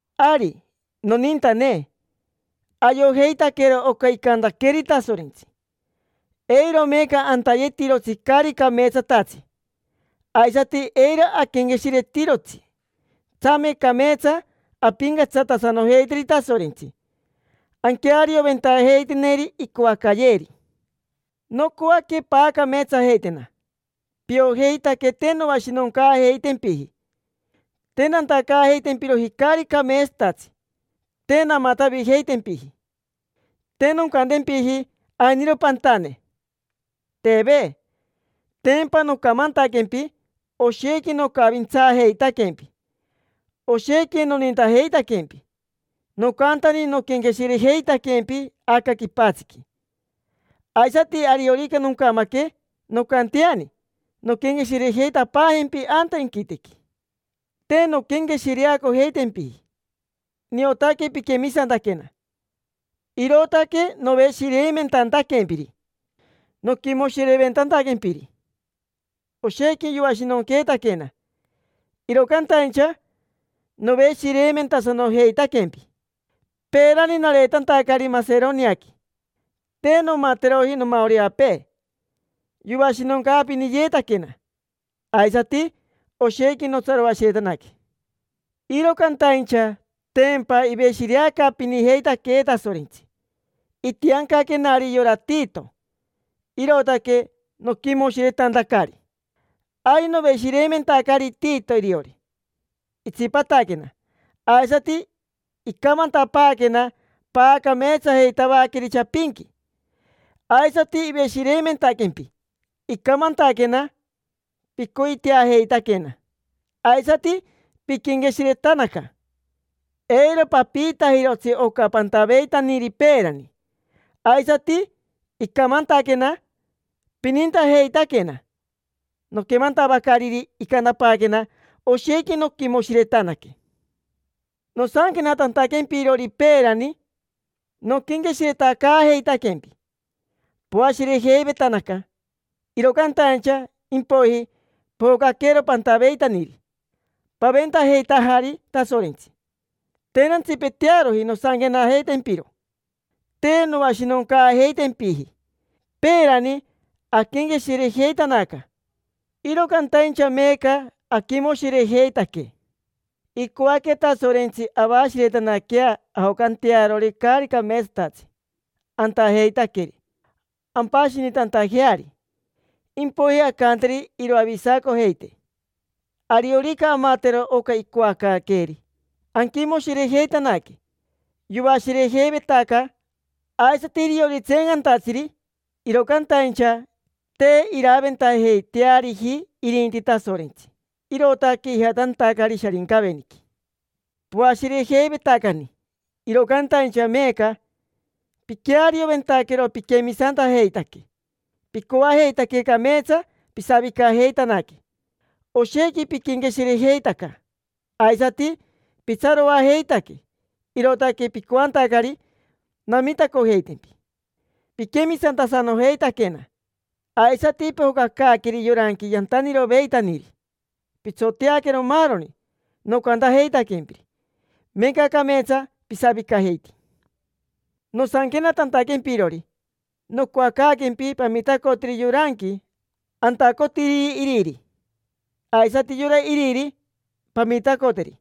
Ari, nonintane, ayojeitaquero oca icantaqueeri Tasorentsi. Eiro meeca antayetirotsi caari cameetsatatsi, aisati eiro aquenqueshiretirotsi. Tsame cameetsa ampincatsatasanojeiteri Tasorentsi, anquearioventajeiteneri icoacayeeri. Nocoaque paacameetsajeitena. Piojeitaque te noashinoncaajeitempiji, te nantacaajeitempiroji caari cameetsatatsi, te namatavijeitempiji. Te noncantempiji ainiro pantane, teve. Tempa nocamantaquempi oshequi nocavintsaajeitaquempi, oshequi nonintajeitaquempi. Nocantani noquenqueshirejeitaquempi aca quipatsiqui. Aisati ariorica noncamaque, noncanteani nonquenqueshirejeitapaajempi anta inquitequi. Te nonquenqueshireacotempiji, niotaque piquemisantaquena, irootaque noveshireimentantaquempiri, noquimoshireventantaquempiri. Oshequi yoashinonqueetaquena, iro cantaincha noveshireimentasanojeitaquempi. Peerani, nareetantacari Maseroniaqui, te nomateroji nomaoreapee: yoashinoncaapiniyeetaquena. Aisati oshequi notsaroashiretanaque. Iro cantaincha tempa iveshireacaapinijeitaquee Tasorentsi. Itiancaquenari yora Tito, irootaque noquimoshiretantacari. Ari noveshireimentacari Tito iriori, itsipataquena. Aisati icamantapaaquena paacameetsajeitavaqueri chapinqui, aisati iveshireimentaquempi. Icamantaquena picoiteajeitaquena, aisati piquenqueshiretanaca: eiro papiitajirotsi oca pantaveitaniri peerani. Aisati icamantaquena pinintajeitaquena. Noquemantavacariri icantapaaquena, oshequi noquimoshiretanaque. Nosanquenatantaquempirori peerani, noquenqueshiretacaajeitaquempi. Poashirejeivetanaca, iro cantaincha impoiji pojocaquero pantaveitaniri, paventajeitajari Tasorentsi. Te nantsipetearoji nosanquenajeitaquempiro, te noashinoncaajeitempiji. Peerani aquenqueshirejeitanaca, iro cantaincha meeca aquimoshirejeitaque. Icoaque Tasorentsi avashiretanaquea ajocantearori caari cameetsatatsi antajeitaqueri, ampashinitantajeari. Impoiji ancanteri iroavisacojeitee. Ariorica amatero oca icoacaaqueeri, anquimoshirejeitanaque. Yoashirejeivetaca aisati iriori tseencantatsiri, iro cantaincha te iraventajeiteariji irinti Tasorentsi, irootaque ijatantacari Sharincaveniqui. Poashirejeivetacani, iro cantaincha meeca piquearioventaquero piquemisantajeitaque. Picoajeitaque cameetsa pisavicajeitanaque. Oshequi piquenqueshirejeitaca, aisati pitsaroajeitaque, irootaque picoantacari namitacojeitempi. Piquemisantasanojeitaquena, aisati pojocacaaqueri yoranqui yantaniroveitaniri. Pitsoteaquero maaroni nocantajeitaquempiri, meeca cameetsa pisavicajeiti. Nosanquenatantaquempirori nocoacaaquempi pamitacoteri yoranqui antacotiriri iriri, aisati yora iriri, pamitacoteri.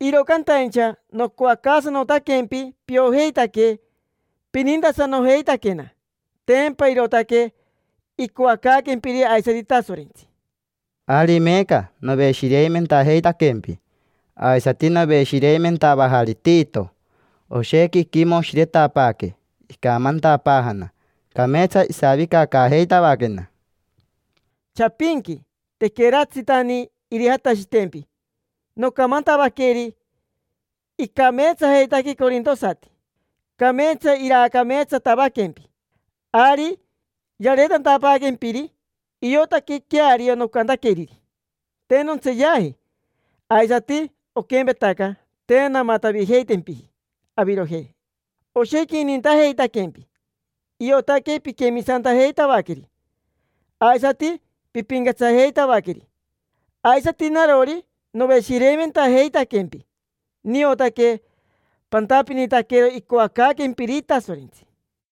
Iro cantaincha nocoacaasanotaquempi piojeitaque pinintasanojeitaquena. Tempa irootaque icoacaaquempiri aisati Tasorentsi. Ari meeca noveshireimentajeitaquempi, aisati noveshireimentavajari Tito. Oshequi iquimoshiretapaaque, icamantapaajana: “Cameetsa isavicacaajeitavaquena”. Chapinqui, tequeratsitani irijatashitempi, nocamantavaqueri: “Icameetsajeitaque corintosati, cameetsa iraacameetsatavaquempi”. Ari yareetantaquempiri iotaque queario nocantaqueriri, te nontseeyaji. Aisati oquempetaca, te namatavijeitempiji avirojei. Oshequi inintajeitaquempi: iotaque piquemisantajeitavaqueri aisati pipincatsajeitavaqueri. Aisati narori, noveshireimentajeitaquempi: niotaque pantapinitaquero icoacaaquempiri Tasorentsi.